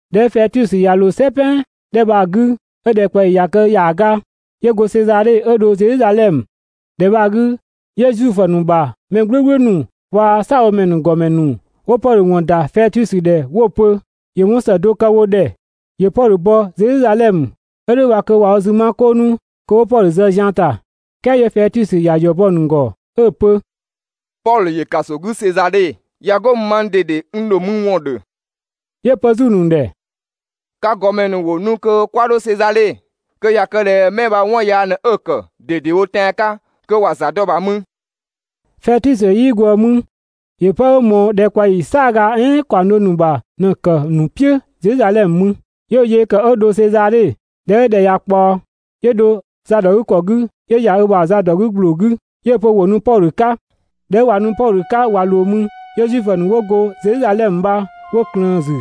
꞊Dhɛ 'ö Fɛtusö ꞊ya ꞊loo "sɛ "pɛan 'dhɛ bha‑ 'gü, 'ö‑ ‑dhɛkpaɔyi ꞊ya kë ‑yaaga, 'yö go Sezadhe 'ö dho Zedhizadhɛmö. ‑Dhɛ bha‑ 'gü, 'yö Zuifö ‑nu ‑bha mɛ "gblʋ̈gblʋ̈ ‑nu waa‑ "saabhomɛ ‑gɔmɛ ‑nu 'wo Pɔdhö ‑wɔn ‑da Fɛtusö ‑dhɛ 'wo‑ pö ‑yö 'wɔn ‑së do kë wo ‑dhɛ, ‑yö Pɔdhö bɔ Zedhizadhɛmö. 'Ö "dhʋ̈ bha kö ꞊wa wo zü ma "kʋʋ 'nu kö 'wo Pɔdhö zë zian ‑ta. "Kɛɛ 'yö Fɛtusö ‑ya ‑yɔ bɔ‑ ‑nu ‑gɔ 'ö‑ pö: «Pɔdhö ‑yö ‑kaso 'gü Sezadhe, ꞊ya 'go mü mang ꞊dede n ‑dho mü ‑wɔn ‑dhö.» 'Yö‑ pö 'zü‑ ‑nu ‑dhɛ: «Ka ‑gɔmɛ ‑nu ‑wo nu kö 'kwa 'dho Sezadhe kö ꞊ya kë ꞊dhɛ 'mɛ bha 'wɔn yaa ꞊në 'ö‑ ‑kë ꞊dedewo tɛan‑ 'ka kö ‑wa ‑za dɔ‑ ‑bha mü.» Fɛtusö 'yii ꞊gwëë mü, ‑yö 'pë 'ö ꞊mɔɔ ‑dhɛkpaɔyi "saaga "ɛɛn ‑kaɔng do ‑nu ‑bha ꞊në‑ ‑kë ‑nu "piʋ̈ Zedhizadhɛmö mü, 'yö ö yee kë 'ö dho Sezadhe. ꞊Dhɛ 'ö ‑dhɛ ꞊ya ꞊kpaɔ, 'yö dho zadɔgükɔ 'gü 'yö ‑ya ö ‑bha za ‑dɔ 'gü ‑gbloo 'gü 'yö‑ pö ‑wo nu Pɔdhö 'ka. ꞊Dhɛ 'ö ꞊wa nu Pɔdhö 'ka ꞊wa ꞊loo mü, 'yö Zuifö ‑nu 'wo go Zedhizadhɛmö bha 'wo ꞊klëën‑ ‑zü,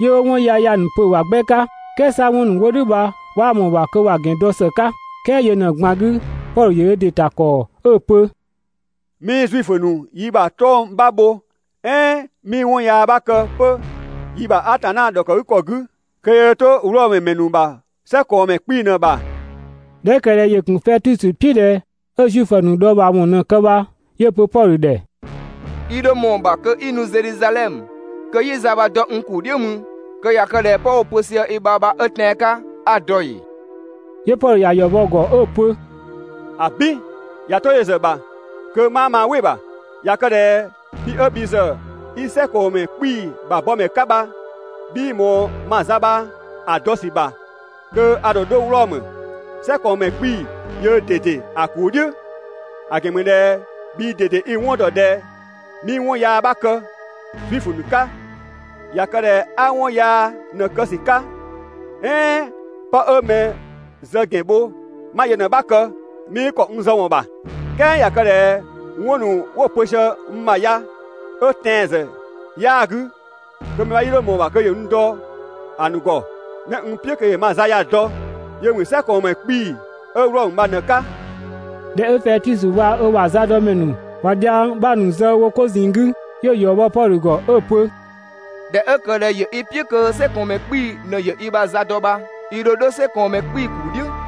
'yö 'wo 'wɔn yaya ‑nu pö‑ ‑bha 'gbɛ 'ka, "kɛɛ 'sa 'wɔn ‑nu 'wo "dhʋ̈ bha 'waa ꞊mɔɔ‑ ‑bha kö ‑wa ‑gɛn bho ‑së 'ka. "Kɛɛ yö ꞊në‑ ꞊gban 'gü, Pɔdhö ‑yö ö ‑dɩ ‑ta ‑kɔɔ 'ö‑ pö: «'Mii Zuifö ‑nu yi ‑bha 'tɔng‑ 'bha bho "ɛɛn 'mii 'wɔn yaa 'bha kë 'pö yi ‑bha Atanna ‑dhɔkëgükɔ 'gü kö yöö 'to‑ Wlɔmö ‑mɛ ‑nu ‑bha "sɛkɔɔnmɛ 'kpii‑ ꞊në‑ ‑bha. ꞊Dhɛ 'ö ‑kë ꞊dhɛ ‑yö ‑gun Fɛtusö "piʋ̈ ꞊dhɛ 'ö Zuifö ‑nu dhɔɔbhaawɔn ꞊në‑ kë bha 'yö‑ pö Pɔdhö ‑dhɛ: «I ‑dho ꞊mɔɔ‑ ‑bha kö 'i nu Zedhizadhɛmö kö 'yi za bha‑ dɔ n ‑kuu "dhiʋ̈ mü kö ꞊ya kë ꞊dhɛ 'pë 'wo‑ pö sië i ‑bha bha 'ö tɛan‑ 'ka 'a‑ dɔ ‑ee?» 'Yö Pɔdhö ‑ya ‑yɔ bɔ‑ ‑gɔ 'ö‑ pö: «‑Abin, ꞊ya 'to yö ‑zë ‑bha kö 'maa maa "wɩ‑ ‑bha, ꞊ya kë ꞊dhɛ bhi 'ö bhi ‑zë 'i "sɛkɔɔnmɛ 'kpii‑ ‑bha bɔmɛ 'ka bha 'bhii ꞊mɔɔ ma za bha‑ dɔ ‑sü ‑bha kö a ‑dho 'dho Wlɔmö, "sɛkɔɔnmɛ 'kpii‑ yöö ꞊dede ‑a ‑kuu "dhiʋ̈, ‑a ‑gɛn ‑mü ꞊dhɛ bhii ꞊dede i‑ 'wɔn ‑dɔ ꞊dhɛ 'mii 'wɔn yaa 'bha kë Zuifö ‑nu 'ka. ꞊Ya kë ꞊dhɛ 'a 'wɔn yaa ꞊në‑ kë ‑sü 'ka "ɛɛn 'pë 'ö mɛ zë ‑gɛn bho 'ma yö ꞊në‑ 'bha kë, 'mii ‑kɔ n zë ‑wɔn ‑bha, "kɛɛ ꞊ya kë ꞊dhɛ 'wɔn ‑nu 'wo‑ pö sië n ‑bha ya 'ö tɛanwɔn ‑zë 'yaa‑ 'gü, kö mɛ 'bha 'yii 'dho ꞊mɔɔ‑ ‑bha kö ‑yö n dɔ‑ ‑nu ‑gɔ. 'Mɛ n "piʋ̈ kö ‑yö ma za ya‑ dɔ yö ‑mü "sɛkɔɔnmɛ 'kpii‑ ('ö Wlɔmö bha) ꞊në‑ 'ka.» ꞊Dhɛ 'ö Fɛtusö waa‑ ö ‑bha zadɔmɛ ‑nu ꞊wa dhiang 'bha ‑nu zë wo 'ko ꞊zinng 'gü, 'yö‑ ‑yɔ bɔ Pɔdhö ‑gɔ 'ö‑ pö: «꞊Dhɛ 'ö ‑kë ꞊dhɛ ‑yö i "piʋ̈ kö "sɛkɔɔnmɛ 'kpii‑ ꞊në ‑yö i ‑bha za dɔ bha, i ‑dho 'dho "sɛkɔɔnmɛ 'kpii‑ ‑kuu "dhiʋ̈.»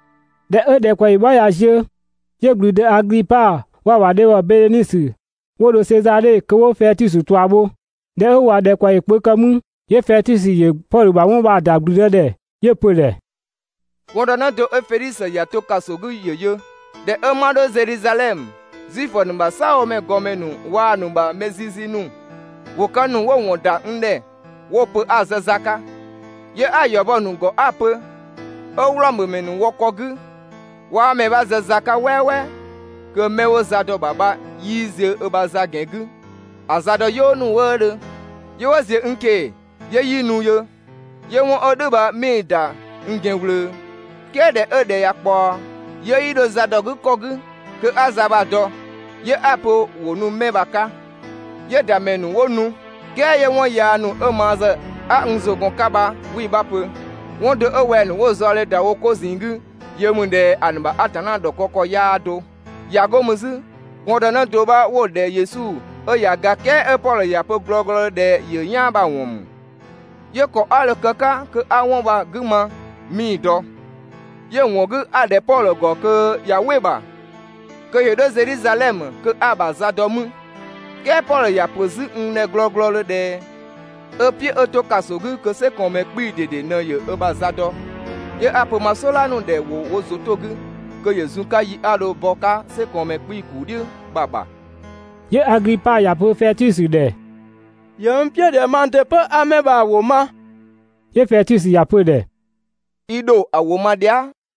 ꞊Dhɛ 'ö ‑dhɛkpaɔyi 'bha ꞊ya ziö, 'yö ‑gblüdë Aglipa waa‑ ‑bha dhebhɔ Bedhenisö 'wo dho Sezadhe kö 'wo Fɛtusö ꞊tua bho. ꞊Dhɛ 'ö ꞊wa ‑dhɛkpaɔyi kpö kë mü, 'yö Fɛtusö ‑yö Pɔdhö ‑bha 'wɔn bha‑ ‑da ‑gblüdë ‑dhɛ, 'yö‑ pö‑ ‑dhɛ: «Gɔndënë do 'ö Fedhisö ‑ya to ‑kaso 'gü ‑yö yö. ꞊Dhɛ 'ö 'ma 'dho Zedhizadhɛmö, Zuifö ‑nu ‑bha "saabhomɛ ‑gɔmɛ ‑nu waa‑ ‑nu ‑bha mɛ zizi ‑nu ‑wo ka ‑nu 'wo‑ ‑wɔn ‑da n ‑dhɛ 'wo‑ pö 'a‑ zë za 'ka. 'Yö 'a‑ ‑yɔ bɔ‑ ‑nu ‑gɔ 'a‑ pö 'ö Wlɔmö ‑mɛ ‑nu wɔ ‑kɔ 'gü 'waa mɛ 'bha zë za 'ka "wɛɛwɛɛ kö 'mɛ 'wo za dɔ‑ ‑bha bha 'yii ziö ö ‑bha za ‑gɛn 'gü ‑a za dɔ "yɔɔ ‑nu wëëdhö, 'yö 'wo ‑ziö n ꞊keng‑ 'yö 'yi nu yö, 'yö 'wɔn 'ö "dhʋ̈ bha 'mii‑ ‑da n ‑gɛn ꞊wlöö, "kɛɛ ꞊dhɛ 'ö ‑dhɛ ꞊ya ꞊kpaɔ, 'yö 'yi dho zadɔgükɔ 'gü kö 'a za bha‑ dɔ, 'yö 'a‑ pö ‑wo nu 'mɛ bha‑ 'ka. 'Yö‑ ‑da ‑mɛ ‑nu 'wo nu, "kɛɛ 'yö 'wɔn yaa ‑nu 'ö ma zë 'a n ‑zʋ gɔn‑ 'ka bha 'wii‑ 'bha pö. 'Wɔn do 'ö wɛng‑ ‑nu 'wo‑ zaɔdhe ‑da wo 'ko ꞊zinng 'gü yö ‑mü ꞊dhɛ ‑a ‑nu ‑bha Atanna ‑dhɔkë ‑kɔ 'yaa do, ꞊ya 'go mü 'zü, gɔndënë do 'bha 'wo‑ ‑dhɛ Yesu 'ö ꞊ya ga "kɛɛ 'ö Pɔdhö ‑ya pö glɔglɔdhö ꞊dhɛ ‑yö "yaan bha‑ ‑wɔn ‑mü. 'Yö ‑kɔ 'a dho‑ kë‑ 'ka kö 'a 'wɔn bha‑ 'gü ma 'mii‑ dɔ, 'yö‑ ‑wɔn 'gü 'a‑ ‑dhɛ Pɔdhö ‑gɔ kö ꞊ya "wɩ‑ ‑bha kö ‑yö 'dho Zedhizadhɛmö kö 'a‑ ‑bha za dɔ 'mü. "Kɛɛ Pɔdhö ‑ya ‑pö 'zü n ‑dhɛ glɔglɔdhö ꞊dhɛ 'ö‑ "piʋ̈ 'ö 'to ‑kaso 'gü kö "sɛkɔɔnmɛ 'kpii‑ ꞊dede ꞊në ‑yö ö ‑bha za dɔ. 'Yö 'a‑ pö ma "sɔdha ‑nu ‑dhɛ ‑wo wo ‑zʋ 'to‑ 'gü kö ‑yö zun‑ 'ka yi 'a dho‑ bɔ‑ 'ka "sɛkɔɔnmɛ 'kpii‑ ‑kuu "dhiʋ̈ bha‑ ‑bha.» 'Yö Aglipa ‑ya pö Fɛtusö ‑dhɛ: «‑Yö n "piʋ̈ ꞊dhɛ mang ‑dɩ 'pö 'a 'mɛ bha‑ ‑wʋ ma.» 'Yö Fɛtusö ‑ya pö‑ ‑dhɛ: «I ‑dho ‑a ‑wʋ ma dhia".»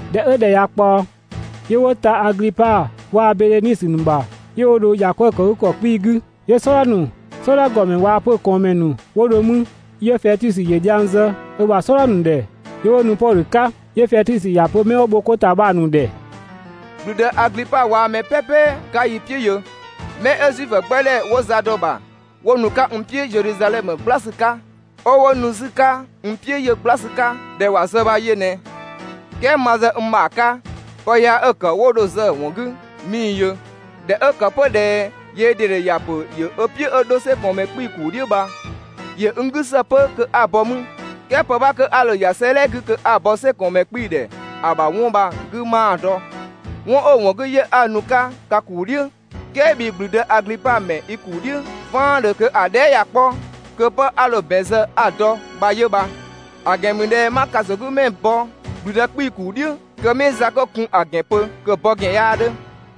꞊Dhɛ 'ö ‑dhɛ ꞊ya ꞊kpaɔ, 'yö 'wo ta Aglipa waa‑ Bedhenisö ‑nu ‑bha, 'yö 'wo dho ‑yakwëëkëgükɔ 'kpii‑ 'gü. 'Yö "sɔdha ‑nu, "sɔdha ‑gɔmɛ waa‑ 'pö‑ ꞊kɔɔnmɛ ‑nu 'wo dho 'mü. 'Yö Fɛtusö ‑yö dhiang zë ö ‑bha "sɔdha ‑nu ‑dhɛ 'yö 'wo nu Pɔdhö 'ka. 'Yö Fɛtusö ‑ya pö 'mɛ 'wo bho 'ko ‑ta bha‑ ‑nu ‑dhɛ: «‑Gblüdë Aglipa waa‑ mɛ "pɛpɛ 'ka yi "piʋ̈ yö, 'mɛ 'ö Zuifö 'gbɛ ‑dhɛ 'wo za dɔ‑ ‑bha 'wo nu‑ 'ka n "piʋ̈ Zedhizadhɛmö "gbla ‑sü 'ka, 'ö 'wo nu 'zü‑ 'ka n "piʋ̈ yö "gbla ‑sü 'ka ꞊dhɛ ‑wa zë bha yö ꞊nɛ. "Kɛɛ ma ‑zë n ‑bha 'ka pë yaa 'ö‑ ‑kë 'ö 'wo dho‑ zë‑ ‑wɔn 'gü 'mii‑ yö. ꞊Dhɛ 'ö ‑kë 'pö ꞊dhɛ yöö ꞊dede ‑ya ‑pö ‑yö ö "piʋ̈ 'ö 'dho "sɛkɔɔnmɛ 'kpii‑ ‑kuu "dhiʋ̈ bha, ‑yö n 'gü ‑së 'pö kö 'a‑ bɔ 'mü. "Kɛɛ pë 'bha 'kö 'a dho‑ ‑ya 'sëëdhɛ 'gü kö 'a‑ bɔ "sɛkɔɔnmɛ 'kpii‑ ‑dhɛ ‑a ‑bha 'wɔn bha‑ 'gü 'maa‑ dɔ. 'Wɔn 'ö‑ ‑wɔn 'gü 'yö 'a nu‑ 'ka ka ‑kuu "dhiʋ̈ "kɛɛ bhii ‑gblüdë Aglipa ‑mɛ i ‑kuu "dhiʋ̈ "vaandhö kö ‑a dhɛɛ" ꞊ya 'kpɔ, kö 'pë 'a dho‑ ‑bɛn zë 'a‑ dɔ bha 'yö bha. ‑A ‑gɛn ‑mü ꞊dhɛ 'ma ‑kasogümɛ bɔ ‑gblüdë 'kpii‑ ‑kuu "dhiʋ̈ kö 'mii za 'kö‑ kun ‑a ‑gɛn pö, kö‑ bɔ ‑gɛn 'yaa 'dhö.»